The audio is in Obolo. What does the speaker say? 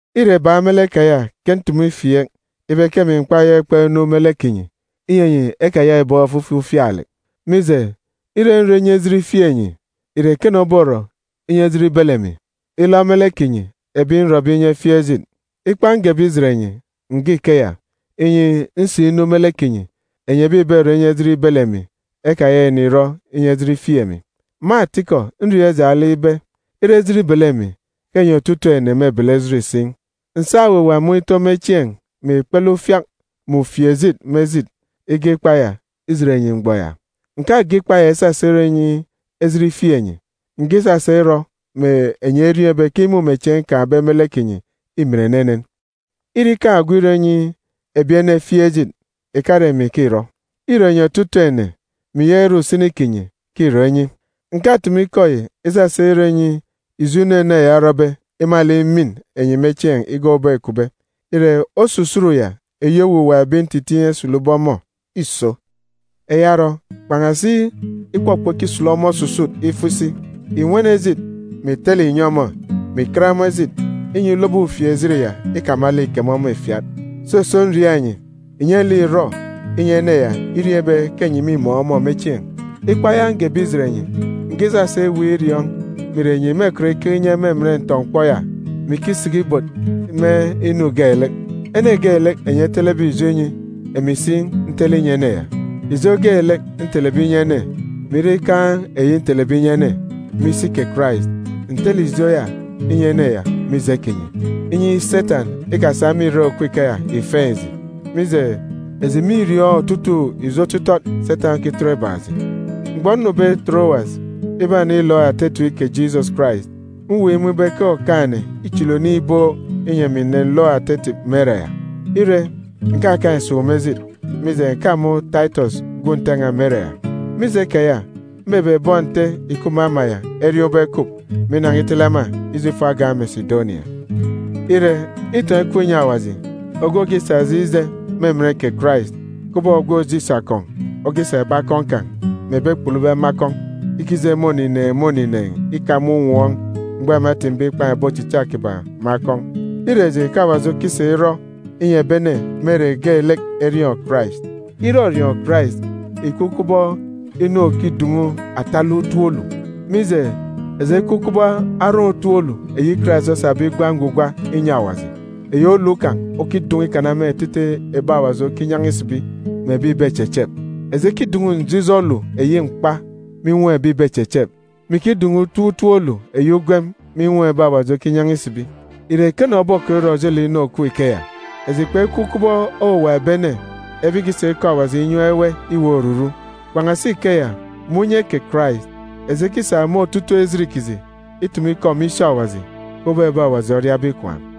Îre bak me lek keya ke ntumu ifieek ibe ke emi m̀kpayaka ikpọk inu me lek kinyi, inyi enyi ekayaka ìbọkọ ofifi ufialek. Mije, ire nrọ inyi ejit ifieek enyi, ìre ekene oborọ inyi ejit ibele emi, ilọ me lek kinyi, ebi nrọbe inyi ejit ifieek? Ikpa ngebe ijet enyi, ǹge ikeya, inyi, nsinu me lek kinyi, enyi ebi ìberọ inyi ejit ibele emi ekayaka ìnirọ inyi ejit ifieek emi. Me atikọ, nriọọn̄ ijaan̄ lek ibe, ire ejit ibele emi, ke enyi otutuuk ene mêbele ejit si. Ǹsa owuwa mun̄ itọ me chieen̄, mè ikpele ufiak mè ufieejit me ejit ige ikpa ya ijet enyi mgbọ ya. Ǹkage ikpa ya isasa irọ inyi ejit ifieek enyi, ǹge isasa irọ mè enyi eriọọn̄ ibe ke imumechieen̄ nkaan̄be me lek kinyi îmin enenen. Ire ikaan̄ ogwu irọ inyi ebi ene efieek ejit, ìkare emi ke îrọ. Îre enyi otutuuk ene, mè ìyaka ire usini kinyi, ke îrọ inyi. Ǹkatumu ikọ yi isasa irọ inyi ijo inu ene ya orọbe imalek imin enyi me chieen̄ igak ubọk îkupbe. Ire, osusut ya eyi owuwa ebi ntitiin̄ esulube ọmọ îso. Eya orọ, kpan̄asi ikpọkpọ ikisulu ọmọ osusut ifo isi, ìnwene ejit, mè ìtele ìnyi ọmọ, mè ìkat ọmọ ejit, inyi ulobo ufieejit ya ikamalek ìkeme ọmọ ìfiat. Soso, nriaak enyi, ìnye lek ìrọ inyi ene ya iriọọn̄ ibe ke enyi mîmun̄ ọmọ me chieen̄. Ikpa ya ngebe ijet enyi, ǹge isasa iweek iriọọn̄ mè ìre enyi mêkọt ikeke inye me emen ntọ-mkpọ ya, mè ikisiki ibot me inu geelek. Ene geelek enyi etelebe ijo inyi, emi si ntele inyi ene ya. Ijo geelek ntelebe inyi ene, mè ire ikaan̄ eyi ntelebe inyi ene, me isi kè Karais, ǹtele ijo ya inyi ene ya mije kinyi, inyi Setan ikasa me irek òkup ikeya ìfeen̄ eji. Mije, eji mîriọọn̄ otutuuk ijo otitọt Setan okitọt ibak eji. Mgbọ nnube Torowas ibanilook ata etip kè Jisọs Karais, mweek imun̄ ibe ke Okaan̄-ene îchili oniin̄ ibook, inyi emi ǹnenlook ata etip me ere ya. Ire, ǹkakaan̄ esuuk me ejit, mije, ǹkamun̄ Taitọs gwun̄ Nte n̄a me ere ya. Mije keya, mbebe bọn Nte ìkup me ama ya eriọọn̄ ubọk ekup, mè inan̄a itele ema ije ifo agan̄ Mesidonia. Ire, itọn̄ ikup inyi Awaji, ogwu òkisa eji ije me emen kè Karais, kubọk ogwu òje isi akọn̄ okisa ebi akọn̄ kan̄ mè ebi ekpulube me akọn̄ ikije me onineen̄ me onineen̄ ika me unwọọn̄ mgbọ ema etimbe ikpan̄ ebi ochicha kiban̄ me akọn̄. Îre eji ke Awaji okisa irọ inyi ebi ene me ere geelek eriọọn̄ Karais. Irọriọọn̄ Karais ìkup kubọk inu òkidun̄u atalek utop olu. Mije, eji ekup kubọk aran̄ utop olu eyi Karais osabe igwa ngwugwa inyi Awaji, eyi olu kan̄ okidun̄u ikana me etete ebi Awaji okinyan̄a isibi, mè ebi ìbechechep. Eji ekidun̄u njijọ olu eyi mkpa me inwọm ebi ìbechechep, mè ikidun̄u utop utop olu eyi ugwem me inwọm ebi Awaji okinyan̄a isibi. Ìre ekene obokọt irọ ojelek inu òkup ikeya? Eji kpekup kubọk owuwa ebi ene, ebi ìkisa ikọ Awaji inyam ewe iweek oruru. Kpan̄asi ikeya, me unye kè Karais, eji ekisa me otutuuk ejit kiji itumu ikọ me isi Awaji, kubọk ebi Awaji oriabe ikwaan̄.